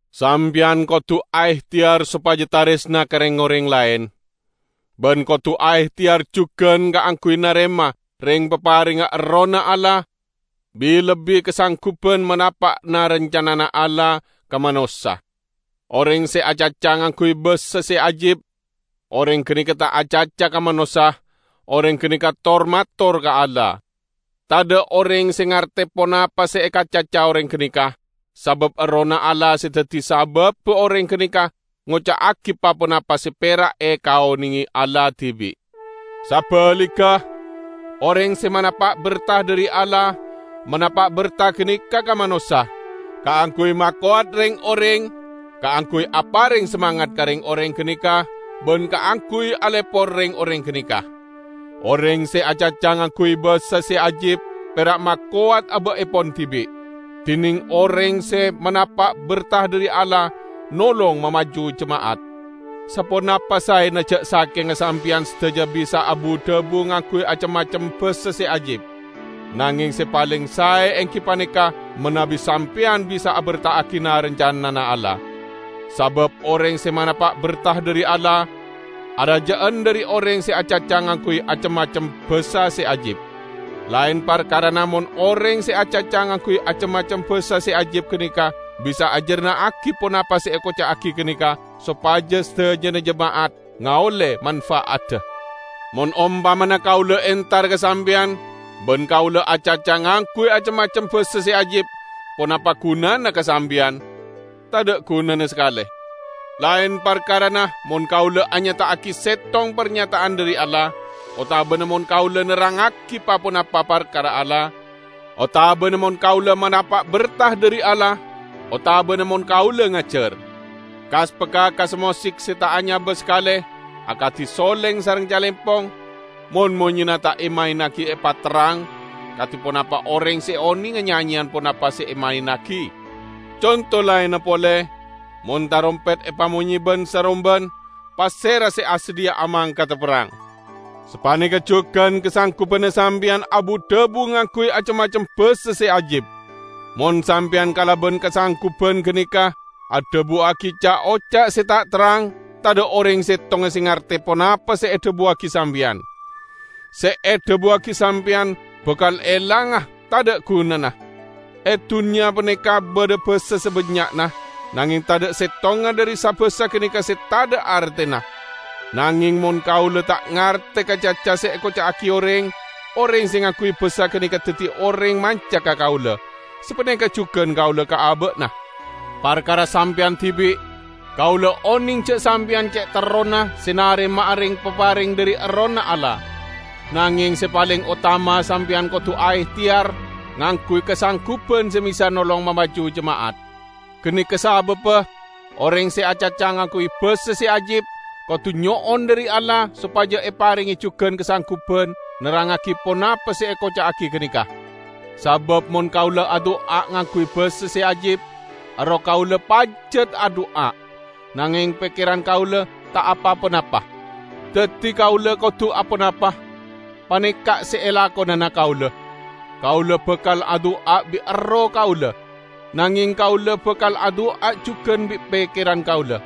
Sampeyan kodu aehteyar sopaja taresna ka reng-oreng laen. Ban kodu aehteyar jugan kaangguy narema reng-paparengnga Errohna Allah, bi-lebbi kasangguban manapa' na-rancanana Allah ka manossa. Oreng se acaca ngangguy basa se ajib, oreng ganeka ta' acaca ka manossa; oreng ganeka tor-mator ka Allah. Tadha' oreng se ngarte ponapa se ekacaca oreng ganeka, sabab Errohna Allah se daddi sababba oreng ganeka ngoca'agi pa-ponapa se pera' ekaonenge Allah dibi'. Sabaligga, oreng se manapa' berta dhari Allah, manapa' berta ganeka ka manossa; kaangguy makowat reng-oreng, kaangguy apareng samangat ka reng-oreng ganeka ban kaangguy alepor reng-oreng ganeka. Oreng se acaca ngangguy basa se ajib pera' makowat aba'epon dibi', dineng oreng se manapa' berta dhari Allah nolong mamaju jema'at. Saponapa saena ja' sakenga sampeyan sadaja bisa abu-dhabu ngangguy acem-macem basa se ajib. Nangeng se paleng sae enggi paneka manabi sampeyan bisa aberta'agi na-rancanana Allah. Sabab oreng se manapa' berta dhari Allah, araja'an dhari oreng se acaca ngangguy acem-macem basa se ajib; laen parkarana mon oreng se acaca ngangguy acem-macem basa se ajib ganeka bisa ajarna'agi ponapa se ekoca'agi ganeka, sopaja sadajana jema'at ngaolle mamfa'adda. Mon ompamana kaula entar ka sampeyan ban kaula acaca ngangguy acem-macem basa se ajib, ponapa gunana ka sampeyan? Tadha' gunana sakale! Laen parkarana mon kaula anyata'agi settong parnyata'an dhari Allah, otabana mon kaula nerrangngagi pa-ponapa parkara Allah, otabana mon kaula manapa' berta dhari Allah, otabana mon kaula ngajar. Kas-pakakassa mosik se ta' anyaba sakale, akadi soleng sareng calempong, mon monyena ta' emaennagi epaterrang, kadi ponapa oreng se onenga nyanyeyan ponapa se emaennagi? Conto laenna pole: Mon tarompet epamonye ban-saromban, pasera se asadhiya'a mangkada aperrang? Sapaneka jugan kasanggubanna sampeyan abu-dhabu ngangguy acem-macem basa se ajib. Mon sampeyan kalaban kasangguban ganeka adhabuwagi ca'-oca' se ta' terrang, tadha' oreng settonga se ngarte ponapa se edhabuwagi sampeyan. Se edhabuwagi sampeyan bakal elanga tadha' gunana. E dunnya paneka badha basa sabannya'na, nangeng tadha' settonga dhari sa-basa ganeka se tadha' artena. Nangeng mon kaula ta' ngarte ka caca se ekoca'agi oreng, oreng se ngangguy basa ganeka daddi oreng manca ka kaula; sapaneka jugan kaula ka aba'na. Parkara sampeyan dibi', kaula oneng ja' sampeyan ce' terrona se narema'a reng-papareng dhari Errohna Allah. Nangeng se paleng otama sampeyan kodu aehteyar ngangguy kasangguban se bisa nolong mamaju jema'at. Ganeka sababba oreng se acaca ngangguy basa se ajib, kodu nyo'on dhari Allah sopaja eparenge jugan kasangguban nerrangngagi ponapa se ekoca'agi ganeka. Sabab mon kaula adu'a ngangguy basa se ajib, erroh kaula pajat adu'a, nangeng pekkeran kaula ta' apa-ponapa. Daddi kaula kodu aponapa? Paneka' se elakonana kaula: Kaula bakal adu'a bi' erroh kaula, nangeng kaula bakal adu'a jugan bi' pekkeran kaula.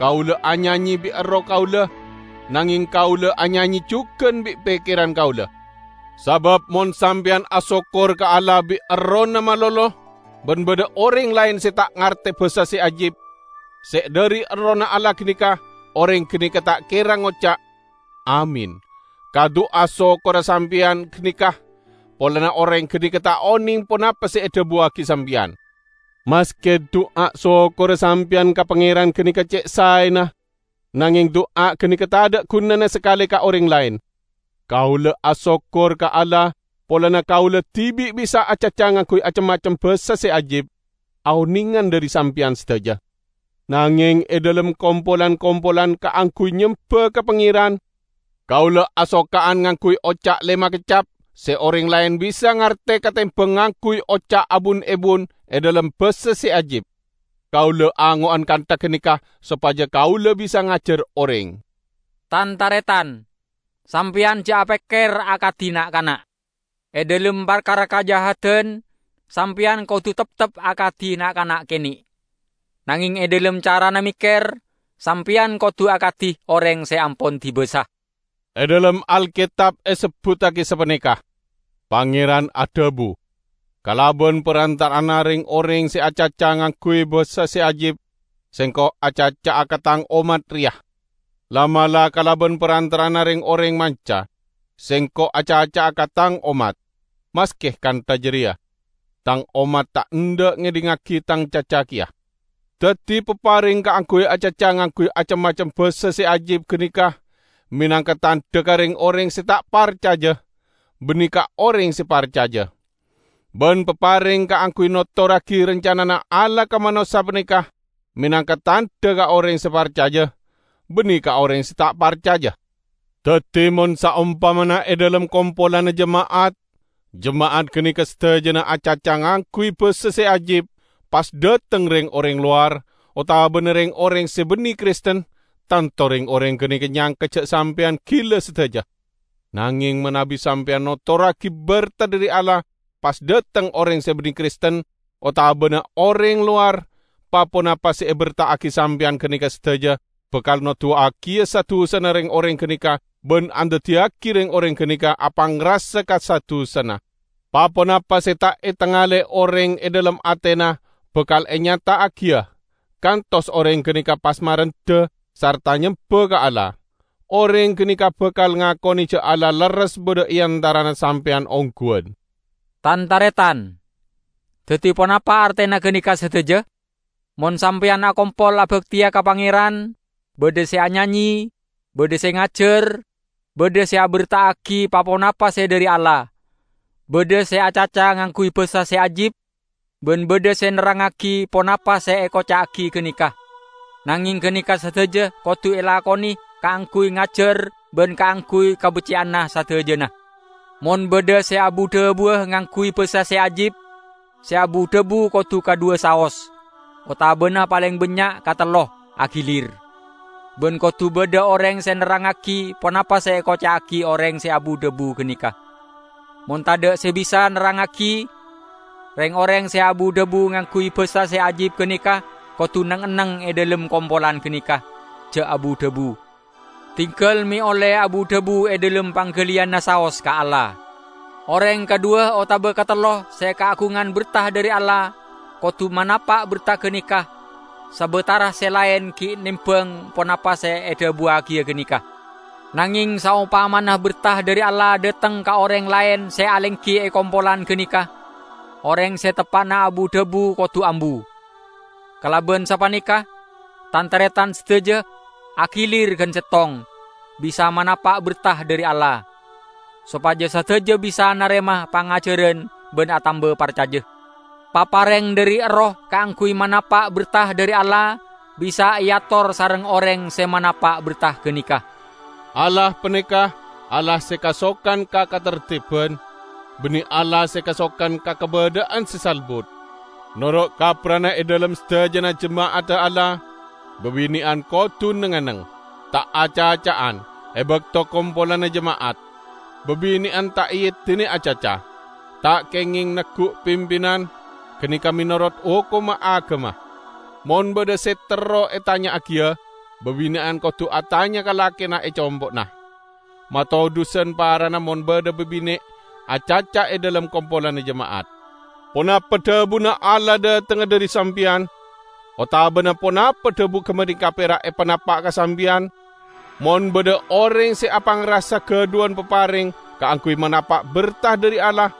Kaula anyanye bi' erroh kaula, nangeng kaula anyanye jugan bi' pekkeran kaula. Sabab mon sampeyan asokkor ka Allah bi' errohna malolo, ban badha oreng laen se ta' ngarte basa se ajib se dhari Errohna Allah ganeka, oreng ganeka ta' kera ngoca', "Amin" ka du'a sokkorra sampeyan ganeka; polana oreng ganeka ta' oneng ponapa se edhabuwagi sampeyan. Maske du'a sokkorra sampeyan ka Pangeran ganeka ce' saena, nangeng du'a ganeka tadha' gunana sakale ka oreng laen. Kaula asokkor ka Allah polana kaula dibi' bisa acaca ngangguy acem-macem basa se ajib, aonengan dhari sampeyan sadaja. Nangeng e dhalem kompolan-kompolan kaangguy nyemba ka Pangeran, kaula asoka'an ngangguy oca' lema keccap se oreng laen bisa ngarte katembang ngangguy oca' abun-ebun e dhalem basa se ajib. Kaula ango'an kantha ganeka sopaja kaula bisa ngajar oreng. Tan-taretan! Sampeyan ja' apekker akadi na'-kana'. E dhalem parkara kajahadan, sampeyan kodu teptep akadi na'-kana' kene'. Nangeng e dhalem carana mekker, sampeyan kodu akadi oreng se ampon dibasa. E dhalem Alketab esebbuttagi sapaneka, "Pangeran adhabu, 'Kalaban parantara'anna reng-oreng se acaca ngangguy basa se ajib, Sengko' acaca'a ka Tang ommat reya. La'-mala' kalaban parantara'anna reng-oreng manca, Sengko' acaca'a ka Tang ommat; maske kantha jareya, Tang ommat ta' endha' ngedhingngagi Tang caca keya.' " Daddi papareng kaangguy acaca ngangguy acem-macem basa se ajib ganeka menangka tandha ka reng-oreng se ta' parcaja, banne ka oreng se parcaja. Ban papareng kaangguy notorragi rancanana Allah ka manossa paneka menangka tandha ka oreng se parcaja, banne ka oreng se ta' parcaja. Daddi, mon saompamana e dhalem kompolanna jema'at, jema'at ganeka sadajana acaca ngangguy basa se ajib, pas dhateng reng-oreng lowar, otabana reng-oreng se banne Kristen, tanto reng-oreng ganeka nyangka sampeyan gila sadaja! Nangeng manabi sampeyan notorragi berta dhari Allah, pas dhateng oreng se banne Kristen otabana oreng lowar, pa-ponapa se eberta'agi sampeyan ganeka sadaja bakal noduwagiya sa-dusana reng-oreng ganeka ban andaddiyagi reng-oreng ganeka apangrasa ka sa-dusana. Pa-ponapa se ta' etengale oreng e dhalem atena bakal enyata'agiya, kantos oreng ganeka pas marendha sarta nyemba ka Allah. Oreng ganeka bakal ngakone ja' Allah lerres badha e antarana sampeyan ongguwan. Tan-taretan! Daddi ponapa artena ganeka sadaja? Mon sampeyan akompol abakteya ka Pangeran, badha se anyanye, badha se ngajar, badha se aberta'agi pa-ponapa se dhari Allah, badha se acaca ngangguy basa se ajib, ban badha se nerrangngagi ponapa se ekoca'agi ganeka. Nangeng ganeka sadaja kodu elakone kaangguy ngajar ban kaangguy kabecce'anna sadajana. Mon badha se abu-dhabuwa ngangguy basa se ajib, se abu-dhabu kodu kadhuwa saos, otabana paleng bannya' katello, agilir. Ban kodu badha oreng se nerrangngagi ponapa se ekoca'agi oreng se abu-dhabu ganeka. Mon tadha' se bisa nerrangngagi, reng-oreng se abu-dhabu ngangguy basa se ajib ganeka kodu neng-enneng e dhalem kompolan ganeka, ja' abu-dhabu. Dinggal me' olle abu-dhabu e dhalem panggaliyanna saos ka Allah. Oreng kadhuwa otaba katello se kaagungan berta dhari Allah kodu manapa' berta ganeka sabatara se laen gi' nembang ponapa se edhabuwagiya ganeka. Nangeng saompamana berta dhari Allah dhateng ka oreng laen se alenggi e kompolan ganeka, oreng se teppa'na abu-dhabu kodu ambu. Kalaban sapaneka, Tan-taretan sadaja, agilir gan settong, bisa manapa' berta dhari Allah; sopaja sadaja bisa narema pangajaran ban atamba parcaja. Papareng dhari Erroh kaangguy manapa' berta dhari Allah bisa eator sareng oreng se manapa' berta ganeka. Allah paneka Allah se kasokan ka katarteban, banne Allah se kasokan ka kabadha'an se salbut. Noro' kapprana e dhalem sadajana jema'adda Allah, babine'an kodu neng-enneng, ta' acaca'an, e bakto kompolanna jema'at. Babine'an ta' eedine acaca. Ta' kengeng neggu' pimpinan; ganeka menorot hokomma agama. Mon badha se terro etanya'agiya, babine'an kodu atanya ka lakena e compo'na. Matodhusan parana mon badha babine' acaca e dhalem kompolanna jema'at. Ponapa dhabuna Allah dhatengnga dhari sampeyan? Otabana ponapa dhabu gapaneka pera' epanapa' ka sampeyan? Mon badha oreng se apangrasa gadhuwan papareng kaangguy manapa' berta dhari Allah,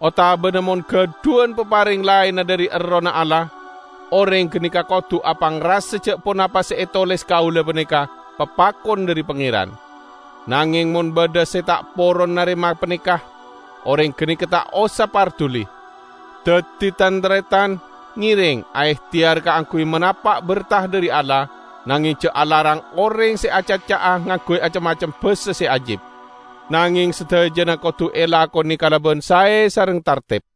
otabana mon gadhuwan papareng laenna dhari Errohna Allah, oreng ganeka kodu apangrasa ja' ponapa se etoles kaula paneka papakon dhari Pangeran. Nangeng mon badha se ta' poron narema paneka, oreng ganeka ta' osa parduli. Daddi, tan-taretan, ngereng aehteyar kaangguy manapa' berta dhari Allah, nangeng ja' alarang oreng se acaca'a ngangguy acem-macem basa se ajib. Nangeng sadajana kodu elakone kalaban sae sareng tarteb.